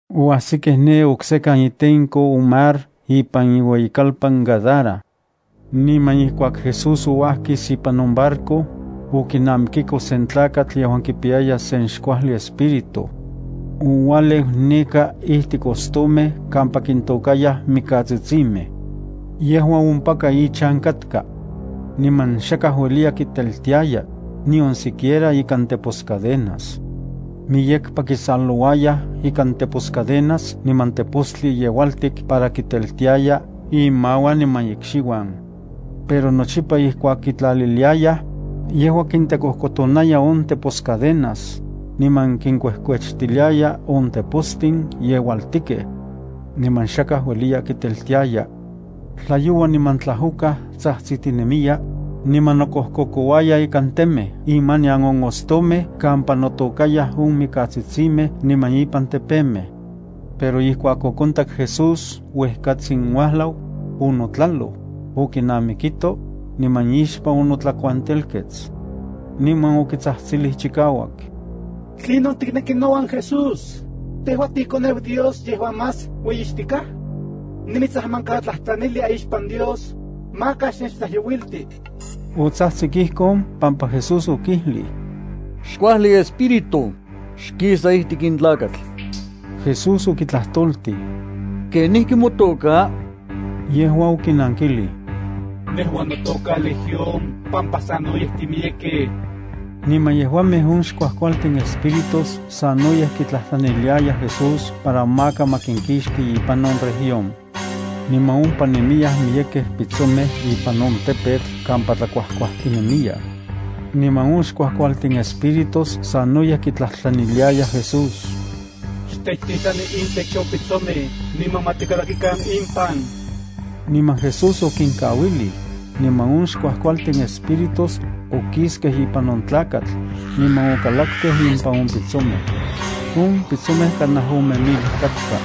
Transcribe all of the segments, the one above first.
Oajsikej ne oksekan itenko on mar ipan iueyitlalpan Gadara. Niman ijkuak Jesús ouajkis ipan on barco, okinamikiko sen tlakatl yejuan kipiyaya sen xkuajli espíritu. Oualeu neka ijtik ostomej kampa kintôkayaj mikatsitsimej. Yejua ompaka ichan katka. Niman xakaj ueliya kiteltiaya, nion siquiera ikan teposcadenas. Miyekpa kisalouayaj ikan teposcadenas niman tepostli yeualtik para kiteltiaya imauan niman ikxiuan. Pero nochipa ijkuak kitlaliliayaj, yejua kitekojkotonaya on teposcadenas, niman kinkuejkuechtiliaya on tepostin yeualtikej. Niman xakaj ueliya kiteltiaya. Tlayoua niman tlajokaj tsajtsitinemiya, niman nokojkokouaya ikan temej imanian on ostomej kampa notôkayaj on mikatsitsimej niman ipan tepemej. Pero ijkuak okontak Jesús uejkatsin uajlau, onotlaloj, okinamikito, niman ixpan onotlakuantelkets. Niman okitsajtsilij chikauak: —¿Tlinon tikneki nouan Jesús, tejua tiiKoneu Dios yejuan más ueyixtikaj? Nimitsajmankatlajtlanilia ixpan Dios, maka xnechtlajyouilti. Otsajtsik ijkon pampa Jesús okijlij: —Xkuajli espíritu, xkisa ijtik in tlakatl. Jesús okitlajtoltij: —¿Kenijki motoka? Yejua okinankilij: —Nejua notoka Legión pampa sanoyej timiyekej. Niman yejuamej on xkuajkualtin espíritus sanoyej kitlajtlaniliayaj Jesús para maka ma kinkixti ipan on región. Niman ompa nemiyaj miyekej pitsomej ipan on tepetl kampa tlakuajkuajtinemiyaj. Niman on xkuajkualtin espíritus sanoyej kitlajtlaniliayaj Jesús: —Xtechtitlani intech on pitsomej niman ma tikalakikan impan. Niman Jesús okinkauilij, niman on xkuajkualtin espíritus okiskej ipan on tlakatl, niman okalakkej impan on pitsomej. On pitsomej kanaj ome mil katka.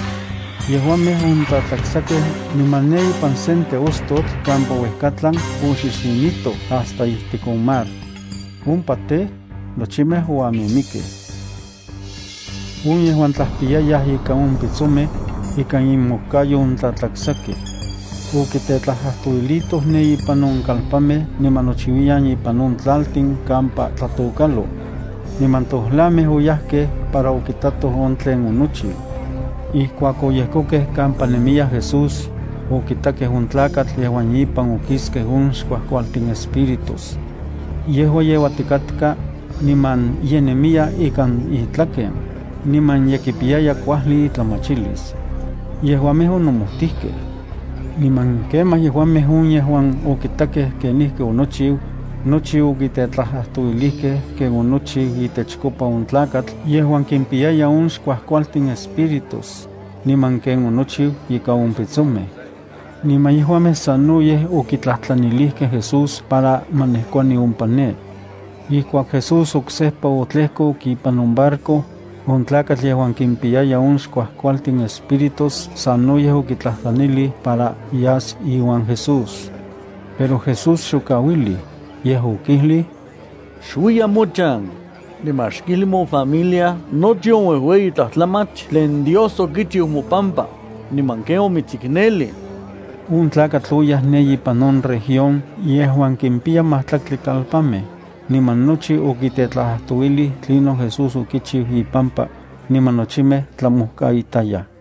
Yejuamej ontlatlaksakej niman ne ipan sen teostotl kampa uejkatlan oxixinitoj hasta ijtik on mar. Ompa tej, nochimej oamimikkej. On yejuan tlajpiyayaj ika on pitsomej, ikan inmojkayo ontlatlaksakej. Okitetlajtlajtouilitoj ne ipan on kalpanmej niman nochiuiyan ipan on tlaltin kampa tlatokalo. Niman tojlamej oyajkej para okitatoj on tlen onochiu. Ijkuak oyejkokej kampa nemiya Jesús, okitakej on tlakatl yejuan ipan okiskej on xkuajkualtin espíritus. Yejua yeuatikatka, niman ye nemiya ikan itlaken, niman ye kipiyaya kuajli itlamachilis. Yejuamej onomojtijkej. Niman kemaj yejuamej on yejuan okitakej kenijki onochiu, nochi okitetlajtlajtouilijkej ken onochiu itechkopa on tlakatl yejuan kimpiyaya on xkuajkualtin espíritus, niman ken onochiu ikan on pitsomej. Niman yejuamej sanoyej okitlajtlanilijkej Jesús para ma nejkuani ompa ne. Ijkuak Jesús oksejpa otlejkok ipan on barco, on tlakatl yejuan kimpiyaya on xkuajkualtin espíritus sanoyej okitlajtlanilij para yas iuan Jesús. Pero Jesús xokauilij, yej okijlij: —Xuiya mochan, niman xkijli mofamilia nochi on uejueyi tlajtlamach tlen Dios okichiu mopampa, niman ken omitsiknelij. On tlakatl oyaj ne ipan on región yejuan kimpiya majtlaktli kalpanmej, niman nochi okitetlajtlajtouilij tlinon Jesús okichiu ipampa, niman nochimej tlamojkaitayaj.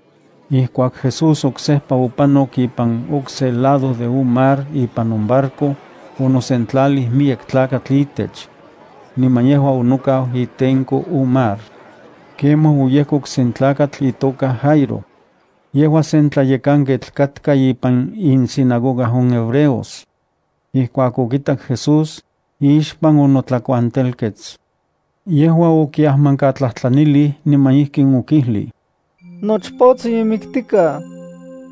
Ijkuak Jesús oksejpa opanok ipan okse lado de on mar ipan on barco, onosentlalij miyek tlakatl itech. Niman yejua onokau itenko on mar. Kemaj oyejkok sen tlakatl itoka Jairo. Yejua sen tlayekanketl katka ipan insinagoga on hebreos. Ijkuak okitak Jesús, ixpan onotlakuantelkets. Yejua okiajmankatlajtlanilij niman ijkin okijlij: —Nochpotsin ye miktikaj.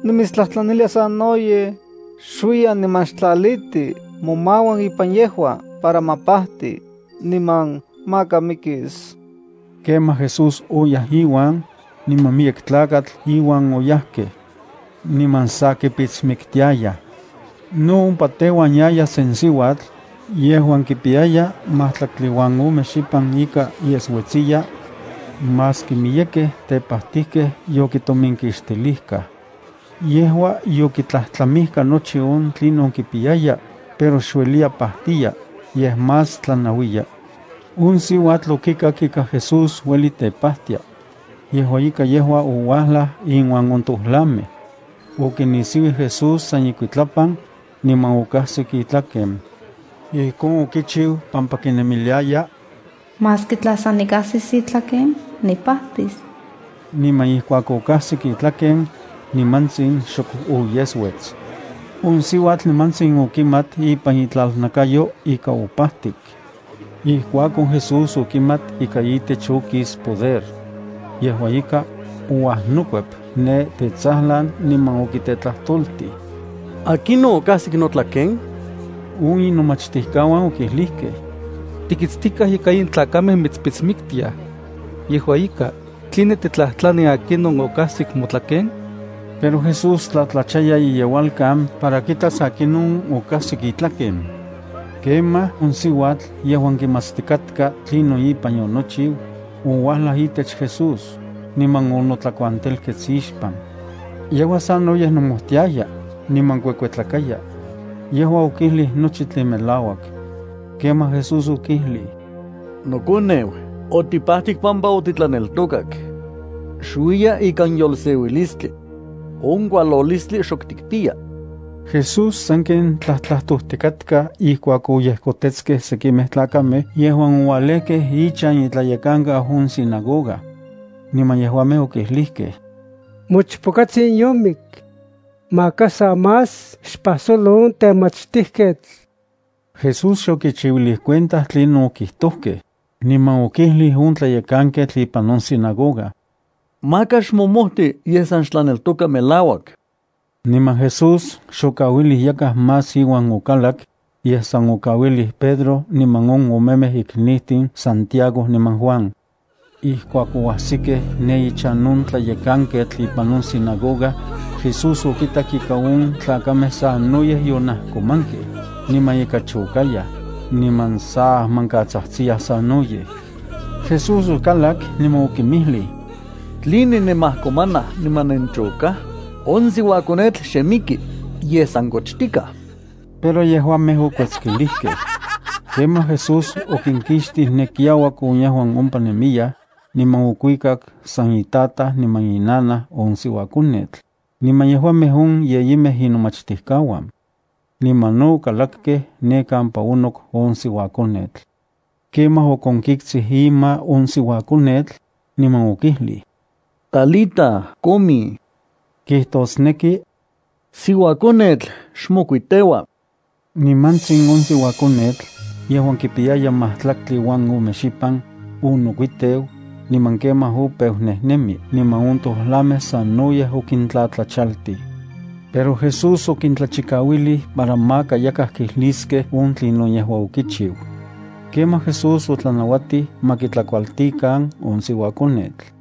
Nimitstlajtlanilia sanoyej, xuiya, niman xtlaliti momauan ipan yejua para ma pajti, niman maka mikis. Kemaj Jesús oyaj iuan, niman miyek tlakatl iuan oyajkej. Niman sa kipitsmiktiayaj. No ompa teuan yaya sen siuatl, yejuan kipiyaya matlaktli uan ome xipan ika yesuetsiya, maski miyekej tepajtijkej yokitominkixtilijkaj. Yejua yokitlajtlamijka nochi on tlinon kipiyaya, pero xueliya pajtiya, yej más tlanauiya. On siuatl okikak ika Jesús ueli tepajtia. Yejua ika yejua ouajlaj inuan on tojlamej. Okinisiuij Jesús san ikuitlapan, niman okajsik itlaken. Ijkon okichiu pampa kinemiliaya: “Maski tla san nikajsis itlaken, nipajtis.” Niman ijkuak okajsik itlaken, nimantsin xok oyesuets. On siuatl nimantsin okimat ipan itlalnakayo ika opajtik. Ijkuakon Jesús okimat ika itech okis poder. Yejua ika, ouajnokuep ne tetsajlan niman okitetlajtoltij: —¿Akinon okajsik notlaken? On inomachtijkauan okijlijkej: —Tikitstikaj ika in tlakamej mitspitsmiktiaj. Yejua ika, ¿tline titlajtlani akinon okajsik motlaken? Pero Jesús tlatlachaya iyeualkan para kitas akinon okajsik itlaken. Kemaj, on siuatl yejuan kimatstikatka tlinon ipan yonochiu, ouajlaj itech Jesús, niman onotlakuantelkets ixpan. Yejua sanoyej nomojtiaya, niman kuekuetlakaya. Yejua okijlij nochi tlen melauak. Kemaj Jesús okijlij: —Nokoneu, otipajtik pampa otitlaneltokak. Xuiya ikan yolseuilistli. On kualolistli xok tikpiya. Jesús sanken tlajtlajtojtikatka ijkuak oyejkotetskej sekimej tlakamej yejuan oualejkej ichan itlayekankau on sinagoga. Niman yejuamej okijlijkej: —Mochpokatsin yomik. Maka sa más xpajsolo on temachtijketl. Jesús xokichiuilij cuenta tlinon okijtojkej, niman okijlij on tlayekanketl ipan on sinagoga: —Maka xmomojti, yej san xtlaneltoka melauak. Niman Jesús xokauilij yakaj más iuan okalak, yej san okauilij Pedro niman on omemej iknijtin Santiago niman Juan. Ijkuak oajsikej ne ichan on tlayekanketl ipan on sinagoga, Jesús okitak ika on tlakamej sanoyej yonajkomankej, niman ika chokayaj, niman sa ajmankatsajtsiyaj sanoyej. Jesús okalak, niman okinmijlij: —¿Tline nenmajkomanaj, niman nenchokaj? On siuakonetl xe miki, yej san kochtikaj. Pero yejuamej okuetskilijkej. Kemaj Jesús okinkixtij ne kiauak on yejuan ompa nemiyaj, niman okuikak san itataj niman inanaj on siuakonetl, niman yejuamej on yeyimej inomachtijkauan. Niman okalakkej ne kampa onok on siuakonetl. Kemaj okonkiktsij ima on siuakonetl, niman okijlij: —Talita, cumi —kijtosneki: Siuakonetl, xmokuiteua. Nimantsin on siuakonetl, yejuan kipiyaya majtlaktli uan ome xipan, onokuiteu, niman kemaj opeu nejnemi. Niman on tojlamej sanoyej okintlatlachaltij. Pero Jesús okintlachikauilij para maka yakaj kijliskej on tlinon yejua okichiu. Kemaj Jesús otlanauatij ma kitlakualtikan on siuakonetl.